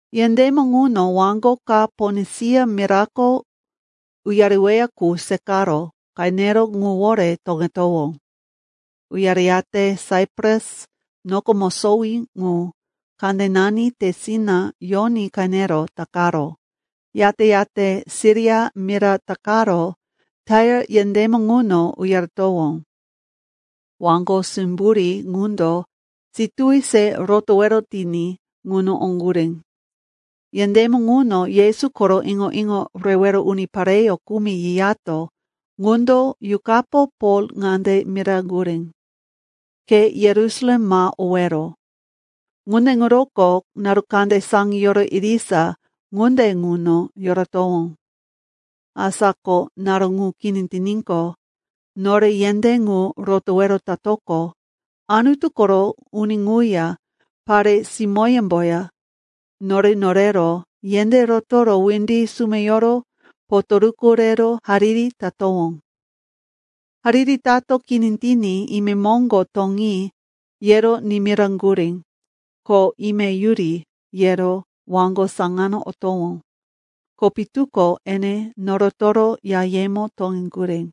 Yendémo ŋuno waŋgo ka Ponisia mirako uyareweya qu seqaro qenero ŋuwore toŋetowó. Uyareyate Saipras noko mosowí ŋu kandenani tesina yoní qenero takaro, yate-yate Siria mira takaro Tair yendémo ŋuno uyaretowó. Waŋgo simburí ŋundo situwi se rotowero tiní ŋuno oŋgurí. Yendémo ŋuno Yesu koro iŋo-iŋo rewero unipareyó kumi yiyato ŋundo Yuqapo Pol ŋande miraŋgurí, “Ke Yerusalem ma owero.” Ŋunde ŋuroko naru kande saŋiyoro irisa ŋunde ŋuno yoratowó. Asa ko naru ŋu kini tiníqo, nore yendé ŋu rotowero tatoqo, Anutu koro uni ŋuya pare-simóyemboya, nore norero yendé rotoro windi sumeyoro potoruku rero hariri tatowó. Hariri tato kini tiní, imemoŋgo toŋi, yero nimiraŋgurí, ko, ime yuri, yero waŋgo saŋano otowó, ko pitu ko ene norotoro yayemo toŋeŋgurí.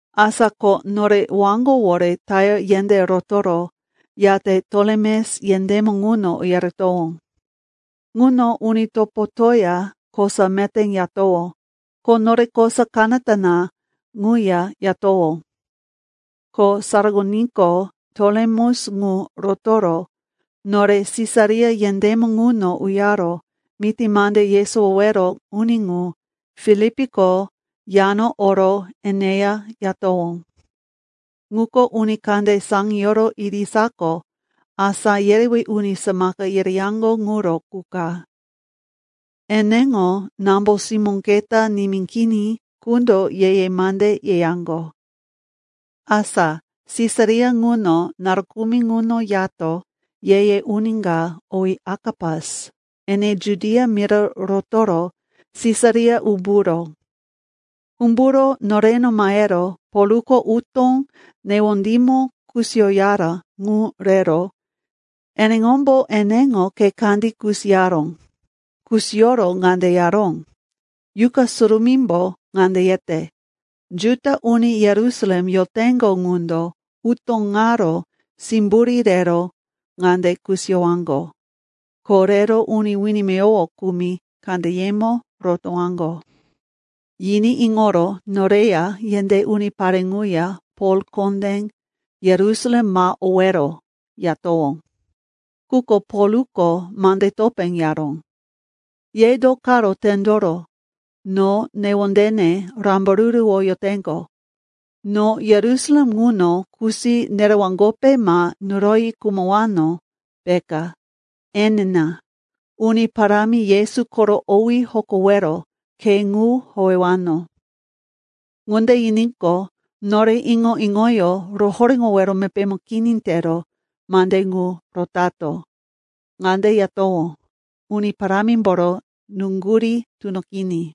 Asa ko nore waŋgowore Tair yendé rotoro, yate Tolemes yendémo ŋuno uyaretowó. Ŋuno uni topotoya kosa meté yatowó, ko nore kosa kanata na ŋuya yatowó. Ko saraŋoníqo, Tolemes ŋu rotoro nore Sisaria yendémo ŋuno uyaro miti mande yesowowero uni ŋu, Filipko yano oro eneya yatowó. Ŋuko uni kande saŋiyoro irisako asá yerewí uni samaka yereyaŋgo ŋuro qu ka. Eneŋo nambo-simó keta nimí kini qundo ye-ye mande yeyaŋgo. Asa Sisaria ŋuno naru kumi ŋuno yato, ye-ye uni ka, owí Akapas, ene Judia mira rotoro Sisaria umburó. Umburo noreno mahero Polko utó newondímo kusiyoyara ŋu rero eneŋombo eneŋo khe kandí kusiyaró. Kusiyoro ŋande yaró, “Yuqa Surumímbo ŋande yete, ‘Juda uni Yerusalem yoteŋgo ŋundo utó ŋaro simburí rero ŋande kusiyowaŋgo, ko rero uni wini meyowo kumi kandeyemo rotowaŋgo.’” Yiní iŋoro noreya yendé unipare ŋuya Pol kondé, “Yerusalem ma owero,” yatowó. Quko Polko mande topé yaró, “Ye do karo tendoro no newondene rambaruruwoyoteŋgo? No Yerusalem ŋuno kusi nerewaŋgope ma nuroyi khumowano, peka. Enina, Uni Parámi Yesu koro owí hokowero khe ŋu howewano.” Ŋunde yiníqo, nore iŋo-iŋoyó rohoréŋowero mepémo kini tero mande ŋu rotato. Ŋande yatowó, “Uni Parámimboro nuŋgurí tunoqiní.”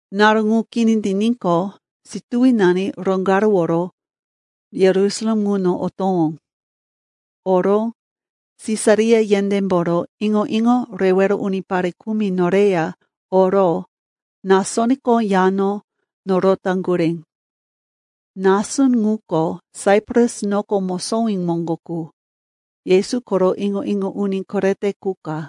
Naru ŋu kini tiníqo, situwinani roŋgaruworo Yerusalem ŋuno otowó. Oro Sisaria yendémboro iŋo-iŋo rewero unipare kumi noreya oro Nasonko yano norotaŋgurí. Nason ŋuko Saipras noko mosowí moŋgo qu, Yesu koro iŋo-iŋo uni korete qu ka.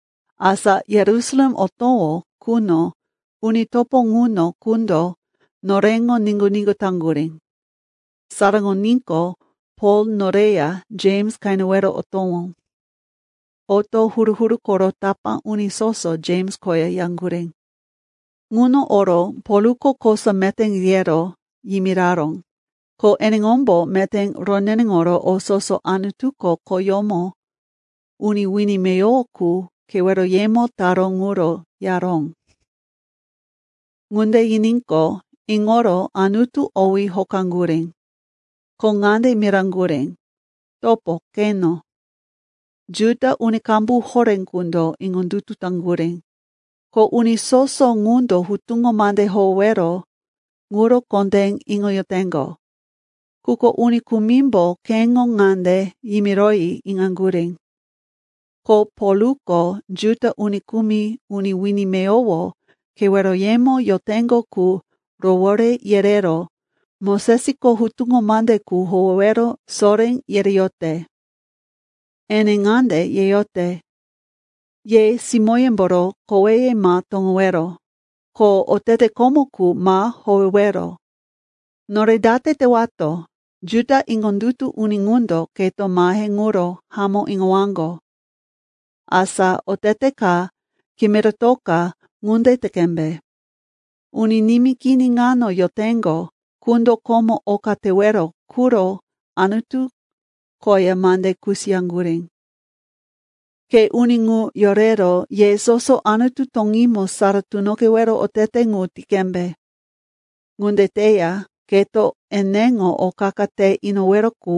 Asa Yerusalem otowó quno uni topo ŋuno qundo noreŋo niŋgu-niŋgu taŋgurí. Saraŋoníqo, Pol noreya Jems qenewero otowó. Oto huru-huru koro tapá uni soso Jems koya yaŋgurí. Ŋuno oro Polko kosa meté yero yimiraró, ko eneŋombo meté roneneŋoro o soso Anutuko khoyómo uni wini meyowo qu keweroyemo taró ŋuro yaró. Ŋunde yiníqo, iŋoro Anutu owí hokaŋgurí. Ko ŋande miraŋgurí, “Topo, qeno. Juda uni qambu horé qundo iŋondutu taŋgurí, ko uni soso ŋundo hutuŋo mande howewero ŋuro kondé iŋoyoteŋgo. Quko uni kumimbo keŋo ŋande yimiroyi iŋaŋgurí, “Ko Polko Juda uni kumi uni wini meyowo keweroyemo yoteŋgo qu rowore yerero Mosesko hutuŋo mande qu howewero soré yereyote. Ene ŋande yeyote, ‘Ye simóyemboro koweye ma toŋowero. Ko otete komo qu ma howewero.’ Nore date tewato? Juda iŋondutu uni ŋundo keto mahe ŋuro hamó iŋowaŋgo. “Asa otete ka kimiratoka ŋunde te qembe. Uni nimí kini ŋano yoteŋgo qundo komo oka tewero quro Anutu koya mande kusiyaŋgurí. Ke uni ŋu yorero ye soso Anutu toŋímo sara tunoqewero otete ŋu ti qembe. Ŋunde teya keto eneŋo o qa-qa te inowero qu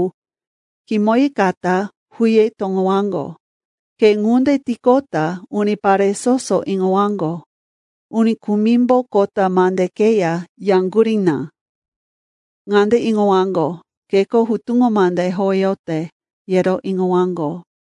kimoyikata huye toŋowaŋgo. Ke ŋunde tiqota unipare soso iŋowaŋgo, uni kumimbo kota mande keya yaŋgurí na. Ŋande iŋowaŋgo, keko hutuŋo mande howeyote, yero iŋowaŋgo.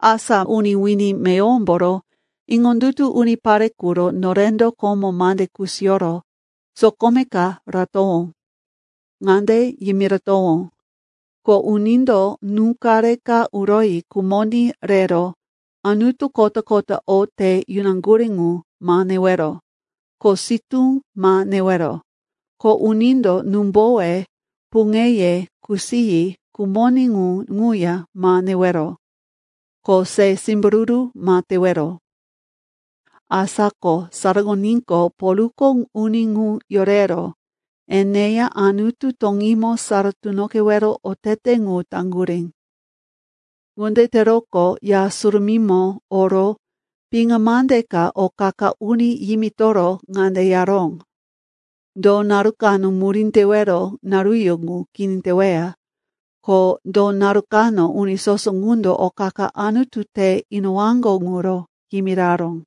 Asa uni wini meyowomboro iŋondutu unipare quro norendo komo mande kusiyoro sokome ka ratowó. Ŋande yimiratowó, ko unindo nú-qare ka uroyi khumoní rero anutu kota-kota o te yunaŋgurí ŋu ma newero, ko sitú ma newero, ko unindo númbowe puŋeye kusiyi khumoní ŋu ŋuya ma newero, ko se simbururu ma tewero.” Asa ko saraŋoníqo, Polko uni ŋu yorero eneya Anutu toŋímo sara tunoqewero otete ŋu taŋgurí. Ŋunde teroqo Ya Surumímo oro piŋa mande ka o qa-qa uni yimitoro ŋande yaró, do naru kano murí tewero naruyó ŋu kini teweya, ko do naru kano uni soso ŋundo o qa-qa Anutu te inowaŋgo ŋuro yimiraró.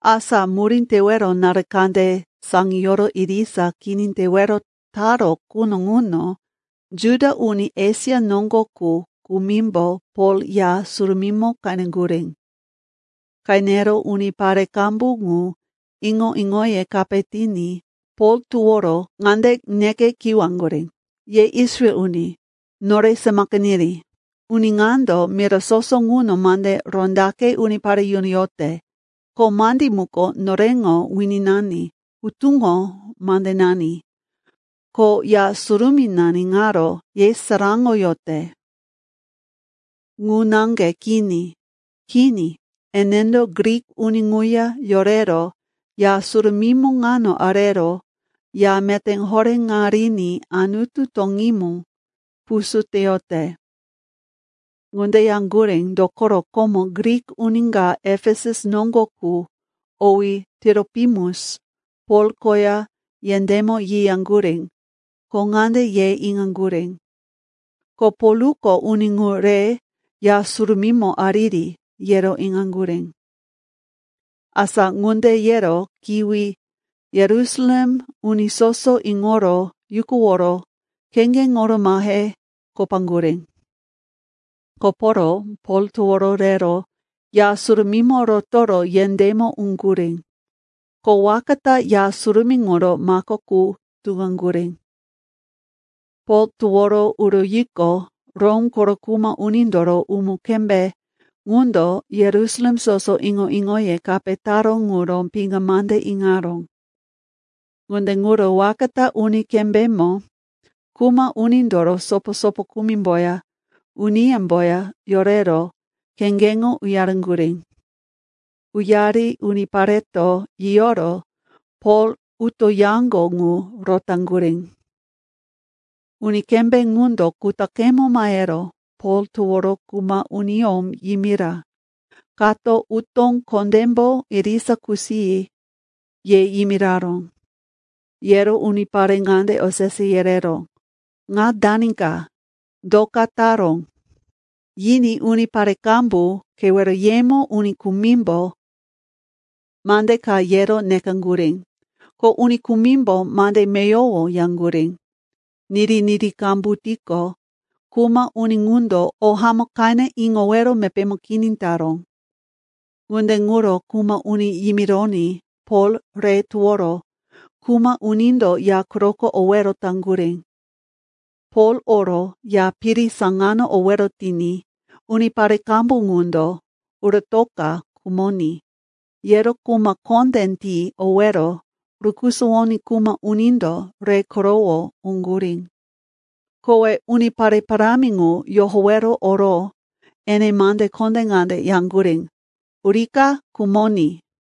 Asa murí tewero naru kande saŋiyoro irisa kini tewero taró quno ŋuno Juda uni Esia noŋgo qu kumimbo Pol Ya Surumímo qeneŋgurí. Qenero unipare qambu ŋu iŋo-iŋoye kape tiní Pol toworo ŋande neke kiwaŋgurí, “Ye Israel uni, nore samaka niri! Uni ŋando mira soso ŋuno mande rondaqe unipare yunoyote, ko mandí muko noreŋo wininani, hutuŋo mandenani, ko Ya Surumínani ŋaro yesaráŋoyote. Ŋu naŋge kini. Kini, enendo Grik uni ŋuya yorero Ya Surumímo ŋano arero Ya meté horé ŋa riní Anutu toŋímo pusú teyote.” Ŋunde yaŋgurí, dokoro komo Grik uni ka Efesus noŋgo qu, owí Tiropimus, Pol koya yendémo yiyaŋgurí, ko ŋande ye iŋaŋgurí, ko Polko uni ŋu re Ya Surumímo ariri, yero iŋaŋgurí. Asa ŋunde yero kiwi Yerusalem uni soso iŋoro yukuworo kheŋgeŋoro mahe kopaŋgurí. Koporo Pol toworo rero Ya Surumímo rotoro yendémo uŋgurí. Ko waka ta Ya Surumí ŋuro mako qu tuŋaŋgurí. Pol toworo uroyiqo, Rom koro kuma unindoro uni kembé ŋundo Yerusalem soso iŋo-iŋoye kape taró ŋuro piŋa mande iŋaró. Ŋunde ŋuro waka ta uni kembémbo kuma unindoro sopo-sopo kumimboya uniyemboya yorero kheŋgeŋo uyaŋgurí. Uyari unipareto yiyoro Pol utoyaŋgo ŋu rotaŋgurí. Uni kembé ŋundo kutaqemo mahero Pol toworo kuma uniyó yimira, kato utó kondémbo irisa kusiyi, ye yimiraró. Yero unipare ŋande osese yereró, “Ŋa dani ka? Do ka taró?” Yiní unipare qambu keweroyemo uni kumimbo mande ka yero nekaŋgurí, ko uni kumimbo mande meyowo yaŋgurí. Niri-niri qambu tiqo, kuma uni ŋundo o hamó qene iŋowero mepémo kini taró. Ŋunde ŋuro kuma uni yimironí Pol re toworo kuma unindo ya quroko owero taŋgurí. Pol oro ya piri saŋano owero tiní unipare qambu ŋundo, uratoka khumoní, yero kuma kondé ti owero rukusuwoní kuma unindo re korowo oŋgurí. Kowe unipare parámi ŋu yohowero oro ene mande kondé ŋande yaŋgurí, “Urika khumoní!”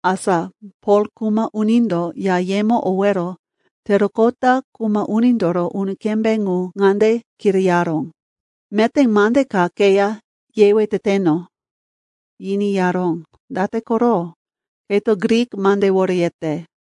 Asa Pol kuma unindo yayemo owero teroqota kuma unindoro uni kembé ŋu ŋande kirayaró, “Meté mande ka keya yewe teteno?” Yiní yaró, “Date koro? Keto Grik mandewore yete.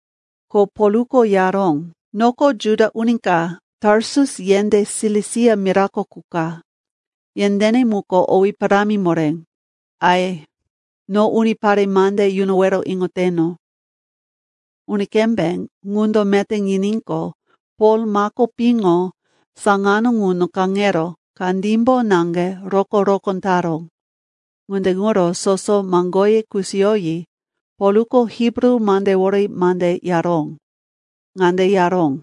Ko Polko yaró, “Noko Juda uni ka, Tarsus yendé Silisia mirako qu ka. Yendéne muko owí parámi moré. Ai, no unipare mande yunowero iŋoteno.” Uni kembé ŋundo meté yiníqo, Pol mako piŋo saŋano ŋuno kaŋero kandímbo naŋge rokó-rokó taró. Ŋunde ŋuro soso maŋgoye kusiyoyi Polko Hibru mandewore mande yaró. Ŋande yaró,